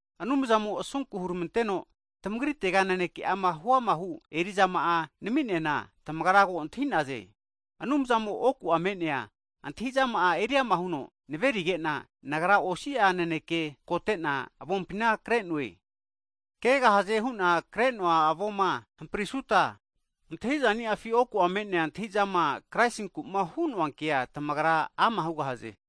Anumzamo'a asunku hurmanteno tamagritega naneke'ama huamahu eri'zama nami'neana tamagra ko antahinegahaze. Anumzamo oku'a me'nea antahi'zama'a eriama huno naverige'na, nagra osi'a naneke kote'na avompina kre'noe. Kegahazema hu'na kre'noa avoma hamprisuta antahi'zaniafi oku'a me'nea antahi'zama Kraisinku'ma hu'noa kea tamagra antahi ama hugahaze.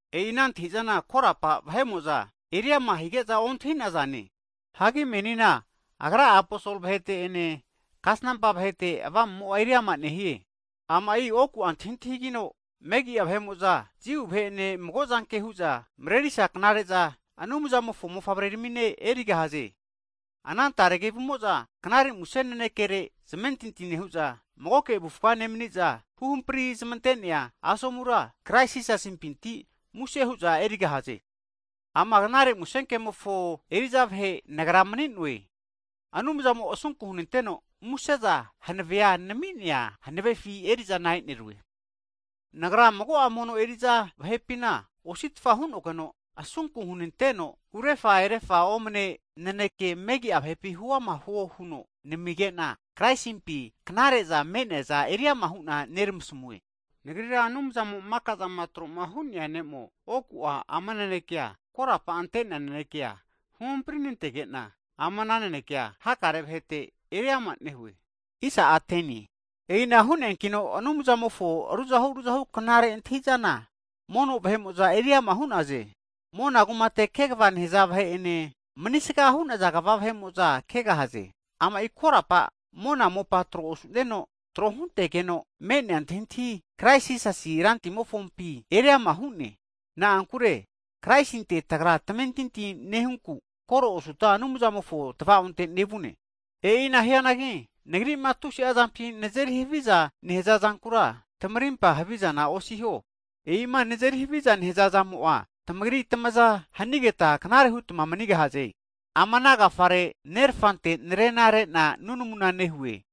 E'i ana antahi'zana korapa vahe'mo'za eriama hige'za ontahi'nazane. Hagi menina Agra'a aposolo vahete'ene kasnampa vahete Avamu'mo eriama nehie. Ama'i oku'a antahintahigino, megi'a vahe'mo'za (Gentiles) Jiu vahe'ene mago'zanke hu'za marerisa knare'zana, Anumzamofo mofavreramine erigahaze. Ana tare kevumo'za knare muse nanekere zamentinti nehu'za, magoke avufa nemani'za, huhampri zamante'nea asomura Krais Jisasimpinti muse hu'za erigahaze. Ama Knare Musenkemofo (Gutnius) eri'za vahe nagra mani'noe, Anumzamo asunku hunanteno muse'za hanavea nami'nea hanave'afi eri'zana e'nerue. Nagra mago'a mono eri'za (saints) vahepina, osi'tfa hu'nogeno asunku hunanteno, urefa erefa'a omne naneke megi'a vahepi huama huo huno namige'na, Kraisimpi knare'za me'neaza eriama hu'na neramasmue. Nagrira Anumzamo maka'zama tro'ma hu'nea Ne'mo, oku'a ama naneke korapa ante'nea nanekea huhampri nantege'na, ama nanekea hakare'a vahete eriama nehue. E'ina hu'neankino Anumzamofona ruzahu ruzahu knare antahi'zana mono vahe'mo'za eriama nehanage'za, mona kunkamumpi kegava nehaza vahe'ene, manisga hu'naza kva vahe'mo'za kegahaze. Ama'i korapa monane, mopane tro osu'neno, tro huntegeno me'nea antahintahi Krais Jisasi Rantimofompi eri ama hu'ne. Na'ankure Kraisinte tagra tamentinti nehunku, koro osuta Anumzamofo tavaonte nevune. E'ina hianagi nagri'ma tusi'a zampi nazeri haviza nehaza zankura tamarimpa havizana osiho, e'ima nazeri haviza nehaza zamo'a tamagri tamaza hanigeta knare hutma manigahaze. Ama ana agafare, Nerfante narena re'na nunamuna nehue.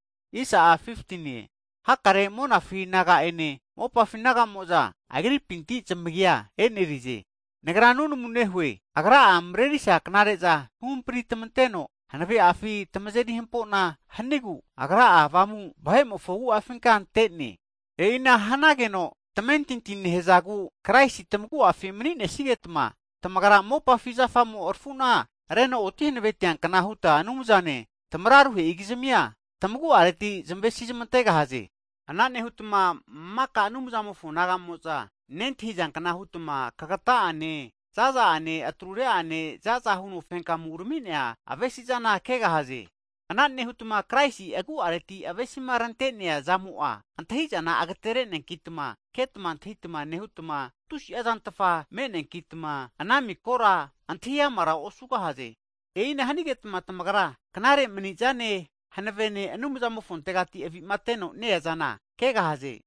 Hakare monafi naga'ene, mopafi naga'mo'za Agripinti zamagia e'nerize. Nagra nunamu nehue, Agra'a marerisa knare'za huhampri tamanteno hanave'afi tamazeri hampo'na hanigu, Agra'a Avamu'a vahe'mofo agu'afinka ante'ne. E'ina hanageno, tamentinti nehazagu Kraisi'a tamagu'afi mani'nesigetma, tamagra mopafi zafamo rafu'na reno oti hanave tiankna huta Anumzane, tamararuhe'i kizmia tamagu'areti huta zamavesi zmantegahaze. Ana nehutma maka Anumzamofo naga'mo'za (saints) nentahizankna hutma kagatahu'ane, zaza'ane, atrure'ane, zaza huno fenka urami'nea avesi'zana kegahaze. Ana nehutma Kraisi agu'areti avesima rante'nea zamo'a antahi'zana agatere'neakitma ketma antahitama nehutma, tusi'a zantfa me'neankitma ana mikora antahi amara osugahaze. E'ina hanigetma tamagra knare mani'zane hanavene Anumzamofontegati avi'mateno ne-eazana kegahaze.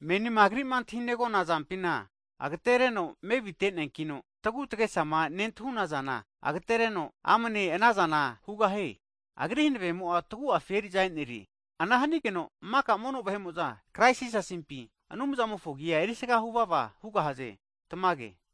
Menina Agri'ma antahima negona zampina agtereno mevite'neankino, tagu tagesama nentahunazana agtereno amne anazana hugahie. Agri hanavemo tagu'afi eri'za e'nerie, Ana hanigeno maka mono vahe'mo'za, Krais Jisasimpi, Anumzamofo agi'a erisga huvava hugahaze. Tamage.